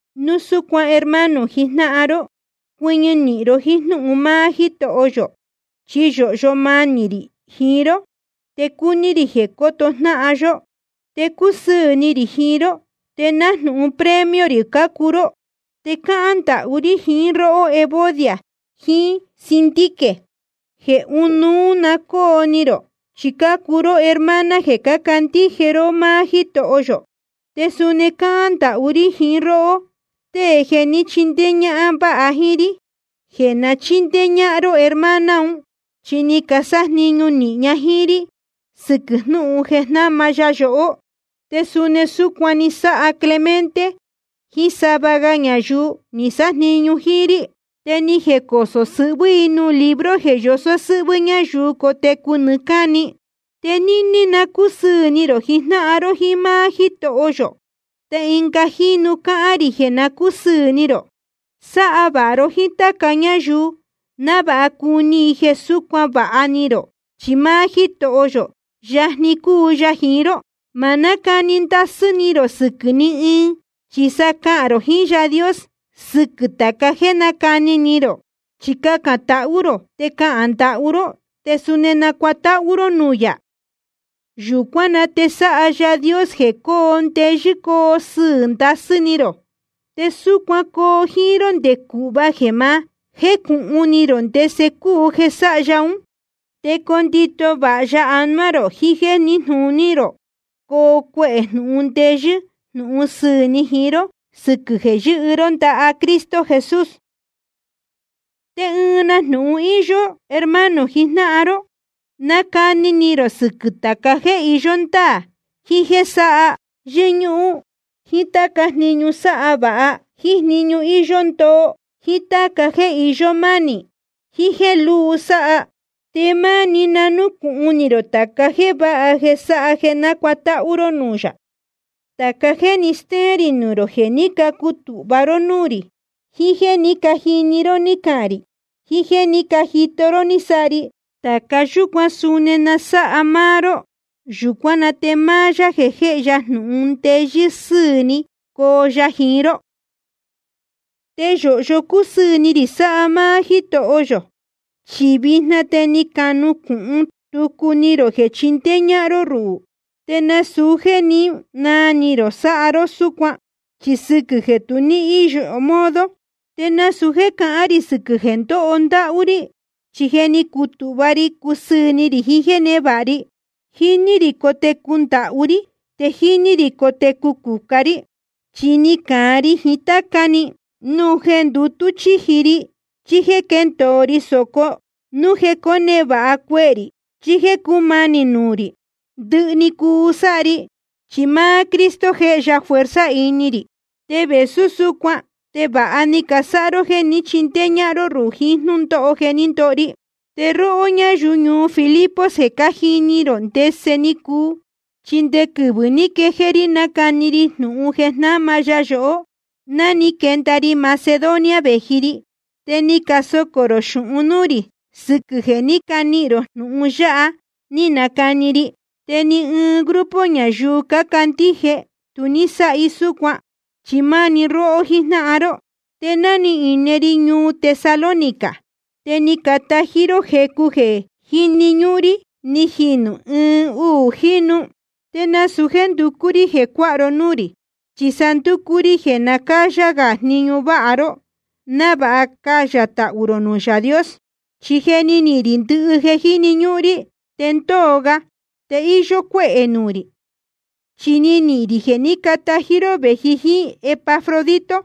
Núu súcuan hermano jijnáhan ró, cuɨñɨ nīhin ró jíín jnúhun máá Jítoho yō. Chi yōhyo manī rī jiín ró, te cúní rī jeē coto jnáhan yó, te cúsɨɨ̄ ni rī jiín ró, te nájnūhun premio rī cácuu ró. Te cáhán ndahú rí jiín róhó Evodia jiín Síntique jeē ɨnuú na cóo ni rō, chi cácuu ró hermana jeē cácandíje ró máá Jítoho yō. Te suni cáhán ndahú rí jiín róhó, tée jeē ní chindéé ñájnáhan vāha jíín rí, jeē na chíndéé ñáhán ró hermana un, chi ni casájniñu nīhin ña jíín rí sɨquɨ̄ jnúhun jeē jnáma ya yohó. Te suni súcuan ni sáha Clemente jíín sava ga ñayuu ni sájniñu jíín rí. Te ni jecosō sɨhvɨ́ i nuū libro jeē yosó sɨ́hvɨ́ ñayuu cotecu nɨɨ́ cáni. Te níní na cúsɨɨ̄ ni rō jijnáhan ró jíín máá Jítoho yō. Te ɨnga jínu cáhán rī jeē na cúsɨɨ̄ ni rō. Sáha vāha ró jíín táca ñáyuu, návāha cuni i jeē súcuan vāha ni rō. Chi máá Jítoho yō, yajni‑ni cúu ya jiín ró. Ma nácani ndasɨ́ ni rō sɨquɨ̄ ni ɨɨn. Chi sa cahān rō jiín Yaā Dios sɨquɨ̄ tāca jéē nácani ni rō. Chi cacān tahú rō, te cahān ndahú ró, te suni nacuatáhú ró nuū yā. Yūcuán na te sáha Yaā Dios jeē cóo ndeyɨ́ coo sɨɨ̄ ndasɨ́ ni rō, te súcuan coo jíín ró nde cūhva jeē ma jécūhun ni rō ndese cúu jeē sáha ya ún. Te condito vāha ya anuá rō jiín jéē níjnūní rō, coo cuehē jnūhun ndeyɨ́ jnūhun sɨɨ̄ ni jiín ró, sɨquɨ̄ jeē yɨ́hɨ ró ndaha Cristo Jesús. Te ɨɨn na jnūhun íyó, hermano jijnáhan ró. Na cáni ni rō sɨquɨ̄ tāca jéē iyó ndáā, jiín jéē sáha yɨ́ñúhún, jíín táca jniñu sáha vāha, jíín jniñu íyó ndoo, jíín táca jéē iyó mánī ni, jiín jéē lúu sáha. Te máni na núcūhun ni rō tāca jéē váha jeē sáha jeē nácuatáhú ró nuū yā. Tāca jéē ni stéén rī nuū rō, jeē ní cacutūhva ró núū rī, jiín jéē ní cajini ró ní cahān rī, jiín jéē ní cajito ró ni sáha ri, tāca yúcuan suni na sáha máá ró. Yūcuán na te máá Yaā jeē jéhe jnūhun ndeyɨ́ sɨ́ɨ̄ ni, coo ya jiín ró. Te yōhyo cúsɨɨ̄ ni rī sáha máá Jítoho yō, chi vijna te ni canucūhun tucu ni rō jeē chindéé ñáhán ró rúhū. Te nasūu jéē ní naa ni rō sáha ró súcuan, chi sɨquɨ̄ jeē tu ní íyo modo. Te nasūu jéē cahán rī sɨquɨ̄ jeē ndóho ndáhú rí, chi je ni cutūhva ri cusɨɨ̄ ni rī jiín jéē névāha ri. Jíní rī cotecu ndahú rí, te jíní rī cotecu cucá rí. Chi ni cāan ri jiín táca‑ni, núu jeē ndutú chíji ri chí jéē ndóho ri sōco, núu jeē cónevāha cuehē rī chí jéē cúmanī nuū rī. Ndɨhɨ‑ni cúu sáha ri, chi máá Cristo jéhe ya fuerza ini rī. Te vēsú súcuan te vāha ni casáha ró jéē ní chindéé ñáhán ró ruhū jiín jnúndóho jeē ndóho ri. Te róhó ñáyuu ñuu Filipos, je cájini rō ndese ni cuu. Chi nde quɨvɨ̄ ní quejéé rí nácani ri jnūhun jeē jnáma ya yohó, ná ni quenda ri Macedonia vēji ri, te ni casocō rō xūhun núū rī sɨquɨ̄ jeē ní canihīn rō jnūhun ya ni nacani ri. Te ni ɨɨn grupo ñayuu cácandíje tu ní sáha súcuan, chi máá‑ni róhó jíjnáhan ró. Te ná íne ri ñuu Tesalónica, te ni catají ró jecu jeē jíni ñúhún rí, ni jinū ɨɨn uū jínu. Te nasūu jéē nducú rí jeē cuáha ró núū rī, chi sa ndúcú rí jeē na cáyá gā jniñu váha ró, návāha cayā tahū rō nuū Yaā Dios. Chi je ni nihīn rī ndɨhɨ jeē jíni ñúhún rí, te ndóo ga. Te íyó cuéhē nuū rī, chi ni nihīn rī jeē ní catají ró vēji jíín Epafrodito.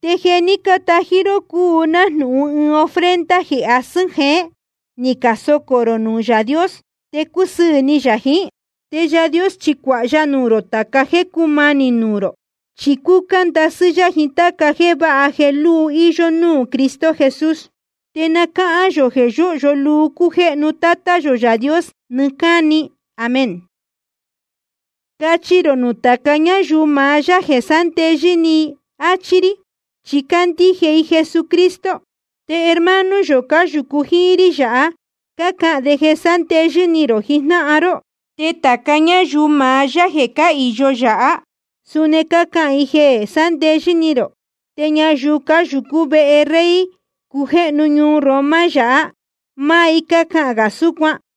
Te jeē ní catají ró cúu nájnūhun ɨɨn ofrenda jeē asɨ́n jeén, ni casocō rō nuū Yaā Dios, te cúsɨɨ̄ ni yā jiín. Te Yaā Dios chi cuāha ya nuū rō tāca jéē cúmanī nuū rō, chi cúcá ndasɨ́ yá jiín táca jéē váha jeē lúu íyó núū Cristo Jesús. Te na cáhán yō jeē yóhyo luu cújéhnu Tátá yō Yaā Dios nɨɨ́ cáni. Amén. Cachi rō nuū tāca ñáyuu maá yá jeē sándeyɨ́ ni i, áchí rí, chi cácandíje i Jesucristo. Te hermano yō cáyūcu jíín rí yáha, cácahān de jeē sándeyɨ́ ni rō jijnáhan ró. Te tāca ñáyuu maá yá jeē cáhīyo yáha, suni cácahān i jeē sándeyɨ́ ni rō. Te ñayuu cáyūcú vehe rey cújéhnu ñuu Roma yáha, máá i cácahān gā súcuan.